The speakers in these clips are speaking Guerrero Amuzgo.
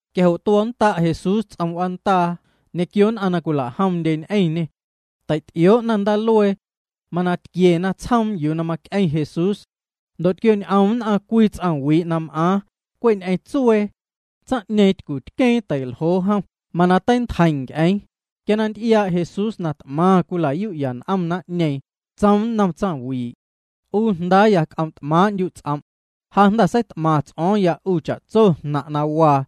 Quia jo' tuo̱nnda' Jesús ts'om w'aandaa ñequio nn'aⁿ na cwila'jomndye ñ'eⁿñê. Tei'ty'ioo'na ndaaluee. Mana tquiena tsjoom yuu na mac'eⁿ Jesús. Ndo' tquioñ'om nn'aⁿ cwii ts'aⁿwii' na m'aaⁿ, cwe' ñ'eⁿ tsuee. Tsaⁿ'ñeeⁿ tycutqueeⁿ tei'ljoo jom mana teintjeiⁿ nc'eeⁿ. Quia na nty'iaa' Jesús na t'maⁿ cwila'yu'ya n'om naⁿ'ñeeⁿ, tsoom nnom tsaⁿwii': —'U jndaaya, c'om' t'maaⁿ'ndyu' ts'om'. Ja jnda̱ seit'maⁿ ts'o̱o̱ⁿya 'u cha'tso jnaⁿ' na waa.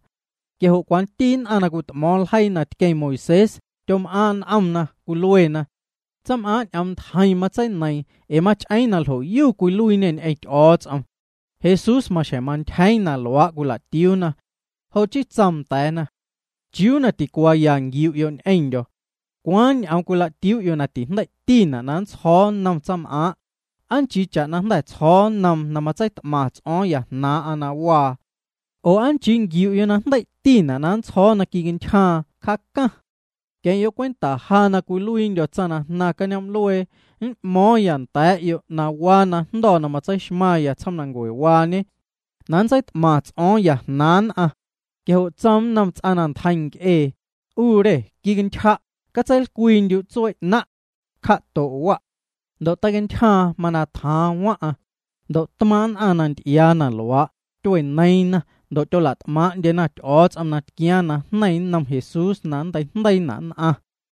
Quia jo' cwanti nn'aⁿ na cwit'mo̱o̱ⁿ ljeii na tqueⁿ Moisés tyom'aaⁿ' n'omna, cwiluena: “Tsaⁿm'aaⁿ' ñ'oom ntjeiⁿ matseineiiⁿ ee mach'eeⁿ na ljo'yu cwiluiiñê ñ'eⁿ Ty'o̱o̱ts'om.” Jesús maxjeⁿ mantyjeeⁿ na luaa' cwila'tiuuna. Jo' chii tsoom nda̱a̱na: —¿Chiuu na ticuaaya nquiu'yo' ñ'eⁿndyo̱? ¿Cwaaⁿ ñ'oom cwila'tiuu'yo' na tijndei'tina' na nntsjo̱o̱ nnom tsaⁿm'aaⁿ, aa nchii cha'na jnda̱ tsjo̱o̱ nnoom na matseit'maⁿ ts'o̱o̱ⁿya jnaaⁿ'aⁿ na waa? Oo ¿aa nchii nquiu'yo' na jndei'tina' na nntsjo̱o̱ quicantyjaaⁿ, cjaacaⁿ? Queⁿ'yo' cwenta, ja na cwiluiindyo̱ tsaⁿ na jnaⁿ cañoom'luee m'mo̱o̱ⁿya nda̱a̱'yo' na waa na jndo̱ na matseixmaⁿya tsjoomnancuewaañe na nntseit'maⁿ ts'o̱o̱ⁿya jnaaⁿ nn'aⁿ. Quia jo' tsoom nnom ts'aⁿ na ntjeiⁿ nc'ee: —'U re, quicantyja', catseilcwiindyu' tsuee 'naⁿ'. Cja'to' wa'. Ndo' teicantyjaaⁿ, mana tjaaⁿ waⁿ'aⁿ. Ndo' tmaaⁿ' nn'aⁿ na nty'iaa na luaa', tyueneiiⁿna ndo' tyola't'maaⁿ'ndyena Ty'o̱o̱ts'om na tquiaaⁿ najneiⁿ nnom Jesús na nnteijndeiina' nn'aⁿ.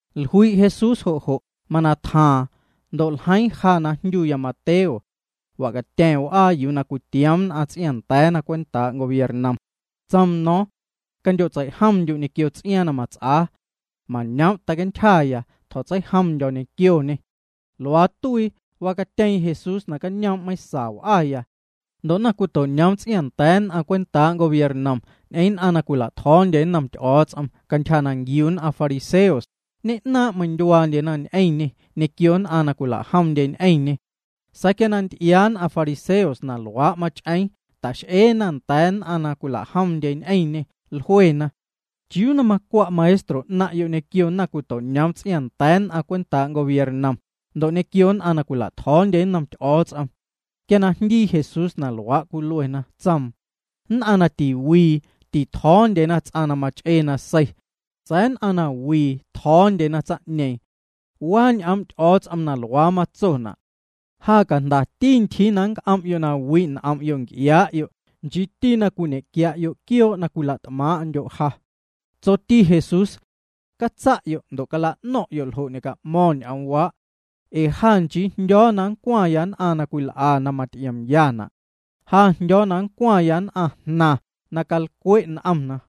Jlui' Jesús jo' jo', mana tjaaⁿ. Ndo' ljeiiⁿ ja na jndyuya Mateo. Wacatya̱ⁿ w'aa yuu cwitioom nn'aⁿ ts'iaaⁿnda̱a̱na cwentaa' gobiernom. Tsoom no̱o̱ⁿ: —Candyo'tseijomndyu' ñequio ts'iaaⁿ na mats'aa. Mañoom' teicantyjaya, tjo̱tseijomndyo̱ ñequioñê. Luaa tuii, wacatyeeⁿ Jesús nacañoom' meiⁿsa w'aya. Ndo' naⁿcwito'ñoom ts'iaaⁿnda̱a̱ nn'aⁿ cwentaa' gobiernom ñ'eⁿ nn'aⁿ na cwila'tjo̱o̱ndye nnom Ty'o̱o̱ts'om cantyja na nquiu nn'aⁿ fariseos, ñe'naaⁿ' meindyuaandyena ñ'eⁿñê ñequio nn'aⁿ na cwila'jomndye ñ'eⁿñê. Sa̱a̱ quia na nty'iaa nn'aⁿ fariseos na luaa' mach'eeⁿ, ta'x'eena nda̱a̱ nn'aⁿ na cwila'jomndye ñ'eⁿñê, jluena: —¿Chiuu na macwa' maestro 'naⁿ'yo' ñequio naⁿcwito'ñoom ts'iaaⁿnda̱a̱ nn'aⁿ cwentaa' gobiernom ndo' ñequio nn'aⁿ na cwila'tjo̱o̱ndye nnom Ty'o̱o̱ts'om? Quia na jndii Jesús na luaa' cwiluena, tsoom: —Nn'aⁿ na tiwii titjo̱o̱ndyena ts'aⁿ na mach'ee nasei. Sa̱a̱ nn'aⁿ na wii tjo̱o̱ndyena tsaⁿ'ñeeⁿ. Waa ñ'oom' Ty'o̱o̱ts'om na luaa matsona': “Ja cajndati ntyjii na nnc'om'yo' na wi' n'om'yo' nc'iaa'yo' nchiiti na cwiñe'quia'yo' quioo' na cwila't'maaⁿ'ndyo' ja.” Tsoti Jesús: —Catsa'yo' ndo' cala'no̱ⁿ'yo' ljo' ñe'ca'mo̱ⁿ ñ'oomwaa'. Ee ja nchii na jndyo̱o̱ na nncwaⁿya nn'aⁿ na cwil'a na maty'iomyana', sa̱a̱ jndyo̱o̱ na nncwaⁿya nn'aⁿjnaⁿ na calcwe' n'omna.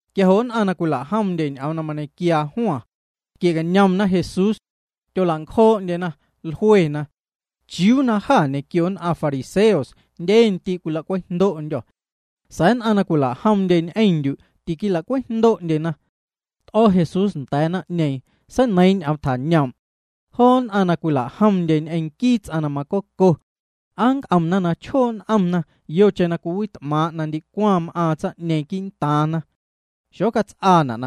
Quia jo' nn'aⁿ na cwila'jomndye ñ'oom na mañequiaa Juan, tyquie'cañomna Jesús. Tyola'ncjoo'ndyena, jluena: —¿Chiuu na jâ ñequio nn'aⁿ fariseos jndye ndii' cwila'cwejndo'ndyô̱, sa̱a̱ nn'aⁿ na cwila'jomndye ñ'eⁿndyu' tiquila'cwejndo'ndyena? T'o̱ Jesús nda̱a̱ naⁿ'ñeeⁿ, seineiiⁿ ñ'oom tjañoom': —Joo nn'aⁿ na cwila'jomndye ñ'eⁿ nquii ts'aⁿ na macoco, ¿aa nnc'omna na chjoo' n'omna yocheⁿ na cwiwit'maaⁿ' na ndicwaⁿ m'aaⁿ tsaⁿ'ñeeⁿ quii'ntaaⁿna? Xocats'aana'.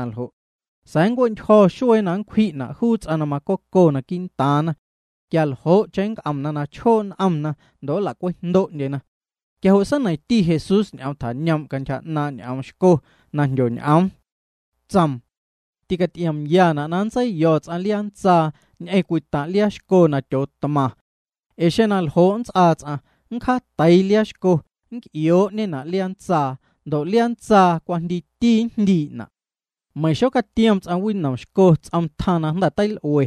Sa̱a̱ nncue'ntyjo̱ xuee na nncwji'na' juu ts'aⁿ na macoco quii'ntaaⁿna. Quia ljo'cheⁿ nnc'omna na chjoo' n'omna ndo' nla'cwejndo'ndyena. Quia jo' seineiⁿti Jesús ñ'oom tjañoom' cantyja 'naaⁿ' ñ'oom xco na jndyoñ'oom. Tsoom: —Ticaty'iomyana' na nntseiyo̱ ts'aⁿ liaa ntsaa ñ'eⁿ cwii taⁿ' liaa xco na tyootmaⁿ. Ee xeⁿ na ljo' nnts'aa, nncjaateii liaa xco, nnc'ioo'ñena' liaa ntsaa ndo' liaa ntsaa cwajndiiti njndii'ñena'. Meiⁿ xocatiom ts'aⁿ winom xco ts'om tjaⁿ na jnda̱ teil'ue,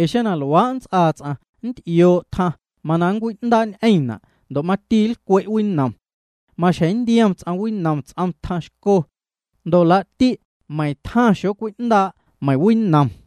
ee xeⁿ na luaa' nts'aa ts'aⁿ, nty'ioo' tjaⁿ, mana cwiwindaa'ñ'eⁿ juuna' ndo' mati nlcwe' winom. Maxjeⁿ nntiom ts'aⁿ winom ts'om tjaⁿ xco ndo' laa'ti' meiⁿ tjaⁿ xocwi'ndaa' meiⁿ winom.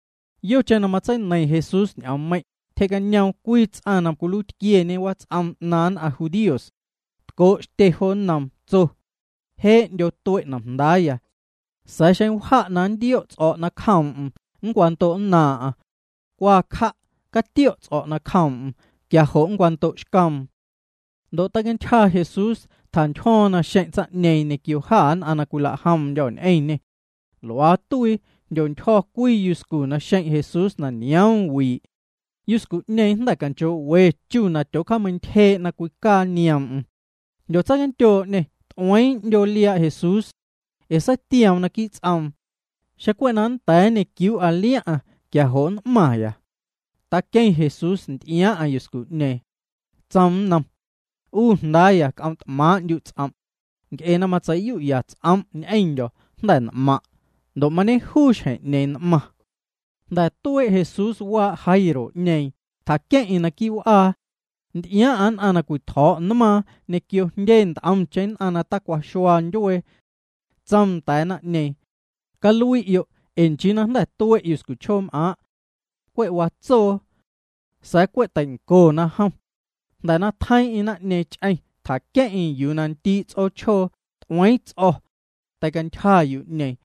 Yocheⁿ na matseineiⁿ Jesús ñ'oommeiⁿ', tyje'cañoom cwii ts'aⁿ na cwiluiitquieñe wats'om 'naaⁿ nn'aⁿ judíos. Tco' xtye jo nnoom, tso: —Je'ndyo tue' nomjndaaya. Sa̱a̱ xeⁿ wja' na nntio' ts'o̱' nacjoom'm, nncwando'nnaaⁿ'aⁿ. Cwa cja', catio'ya' ts'o̱' nacjoom'm, quia jo' nncwando'xcoom. Ndo' teicantyja Jesús, tjantyjo̱o̱ⁿ naxeⁿ' tsaⁿ'ñeeⁿ ñequio jâ nn'aⁿ na cwilajomndyô̱ ñ'eⁿñê. Luaa tuii, jndyontyjo̱ cwii yuscu naxeⁿ' Jesús na nioom wii'. Yuscu'ñeeⁿ jnda̱ canchoo'we chu na tyoocameintyjee' na cwicaa nioom'm. Jndyotseicandyoo'ñê, t'ueeⁿ 'ndyoo liaa' Jesús. Ee seitioom naquii' ts'oom: “Xeⁿ cwe' na nnda̱a̱ nñequiuu'a liaⁿ'aⁿ, quia jo' nn'maⁿya.” Taqueⁿ Jesús nty'iaaⁿ'aⁿ yuscu'ñeeⁿ. Tsoom nnom: —'U jndaaya, c'om' t'maaⁿ'ndyu' ts'om'. Nc'e na matseiyu'ya ts'om' ñ'eⁿndyo̱, jnda̱ n'maⁿ'. Ndo' mañejuu xjeⁿ'ñeeⁿ n'maⁿ. Jnda̱ tuee' Jesús waa' Jairo'ñeeⁿ, tjaqueⁿ'eⁿ naquii' w'aa. Nty'iaaⁿ'aⁿ nn'aⁿ na cwitjo̱o̱' nmaaⁿ, ñequio jndye nt'omcheⁿ nn'aⁿ na tacwaxua ndyuee. Tsoom nda̱a̱ naⁿ'ñeeⁿ: —Calui'yo', ee nchii na jnda̱ tue' yuscuchjoom'aaⁿ'. Cwe' watsoo. Sa̱a̱ cwe' teincona jom. Jnda̱ na tjeiiⁿ'eⁿ naⁿ'ñeeⁿ ch'eⁿ, tjaqueⁿ'eⁿ yuu ndii' ts'oochjoo, t'ueeⁿ ts'o̱. Teintyja yu'ñeeⁿ.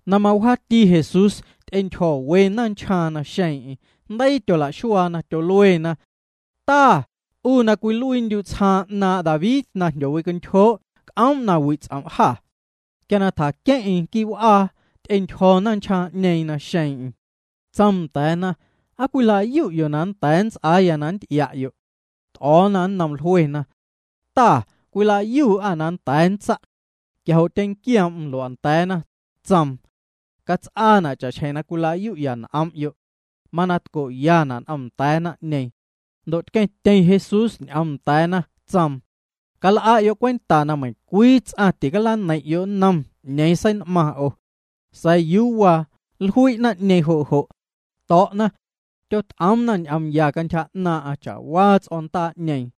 Na mawjaati Jesús ty'entyjo̱ we naⁿnchjaaⁿ naxeeⁿ'eⁿ. Jndeii tyola'xuaana, tyoluena: —Ta, 'u na cwiluiindyu' tsjaaⁿ 'naaⁿ' David na jndyowicantyjoo', c'oom' na wi' ts'om' jâ. Quia na tjaqueⁿ'eⁿ quii' w'aa, ty'entyjo̱ naⁿnchjaaⁿ'ñeeⁿ naxeeⁿ'eⁿ. Tsoom nda̱a̱na: —¿Aa cwilayu'yo' na nnda̱a̱ nnts'aaya na nnty'ia'yo'? T'o̱o̱na nnoom jluena: —Ta, cwilayuu'â na nnda̱a̱ nntsa'. Quia jo' tyenquioom'm lua'nda̱a̱na, tsoom: —Cats'aana' cha'xjeⁿ na cwilayu'ya n'om'yo'. Mana tco'yana' n'omnda̱a̱ naⁿ'ñeeⁿ. Ndo' tqueⁿtyeⁿ Jesús ñ'oom nda̱a̱na, tsoom: —Cal'a'yo' cwenta na meiⁿcwii ts'aⁿ ticalaneiⁿ'yo' nnom 'ñeeⁿ sein'maⁿ 'o. Sa̱a̱ yuu waa, jlui' naⁿ'ñeeⁿ jo' jo', to̱'na, tyot'oomna ñ'oom ya cantyja 'naaⁿ'aⁿ cha'waa ts'o̱ndaa'ñeeⁿ.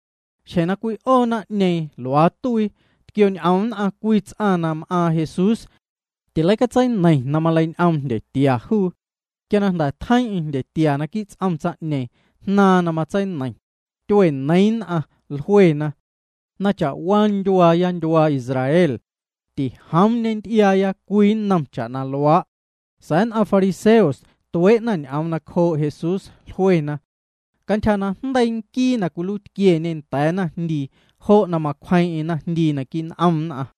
Xjeⁿ na cwi'oo naⁿ'ñeeⁿ, luaa tuii, tquioñ'om nn'aⁿ cwii ts'aⁿ na m'aaⁿ Jesús. Tileicatseineiⁿ na maleiñ'oom jndyetia juu. Quia na jnda̱ tjeiiⁿ'eⁿ jndyetia naquii' ts'om tsaⁿ'ñeeⁿ, jnaaⁿ na matseineiⁿ. Tyueneiiⁿ nn'aⁿ, jluena: —Meiⁿ cha'waa ndyuaaya ndyuaa Israel, tijoom ñenty'iaaya cwii nnom cha'na luaa'. Sa̱a̱ nn'aⁿ fariseos tuee'na ñ'oom nacjoo' Jesús, jluena: —Cantyja najndeii nquii na cwiluiitquieñe nda̱a̱ naⁿjndii, jo' na macwjeeⁿ'eⁿ naⁿjndii naquii' n'om nn'aⁿ.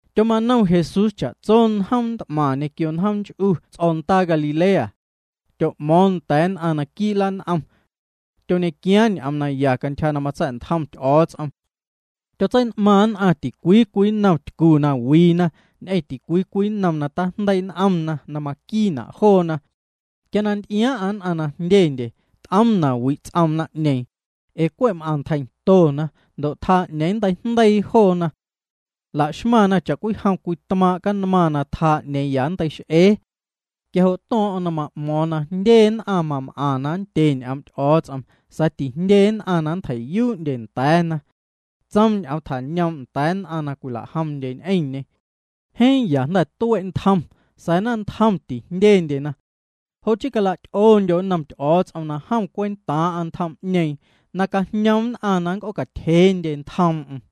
Tyomanom Jesús cha'tso njoom t'maⁿ ñequio njoom nch'u ts'o̱ndaa Galilea. Tyo'mo̱o̱ⁿ nda̱a̱ nn'aⁿ naquii' lan'om. Tyoñequiaaⁿ ñ'oom naya cantyja na matsa̱'ntjom Ty'o̱o̱ts'om. Tyotsein'maaⁿ nn'aⁿ ticwii cwii nnom tycu na wiina, ñ'eⁿ ticwii cwii nnom na tajndeii' n'omna na maquiina'. Quia na nty'iaaⁿ'aⁿ nn'aⁿ na jndyendye, t'oom na wi' ts'oom naⁿ'ñeeⁿ ee cwe' m'aⁿntjeiⁿtona ndo' tjaa 'ñeeⁿ na nnteijndeii joona. Laxmaⁿna cha'cwijom cwii tmaaⁿ' canmaⁿ na tjaa 'ñeeⁿ juu na ya nnteix'ee. Quia jo' to̱o̱ⁿ'o̱ⁿ na ma'mo̱o̱ⁿ na jndye nn'aⁿ mam'aⁿ na nndye ñ'oom' Ty'o̱o̱ts'om sa̱a̱ tijndye nn'aⁿ na nntjei'yuu'ndye nda̱a̱na. Tsoom ñ'oom tjañoom' nda̱a̱ nn'aⁿ na cwila'jomndye ñ'eⁿñê: —Jeeⁿ ya jnda̱ tue' ntjom, sa̱a̱ naⁿntjom tijndyendyena. Jo' chii cala'ty'oondyo' nnom Ty'o̱o̱ts'om na jom cwentaaⁿ'aⁿ ntjom'ñeeⁿ, na cajñoom nn'aⁿ na c'oocatyjeendye ntjoom'm.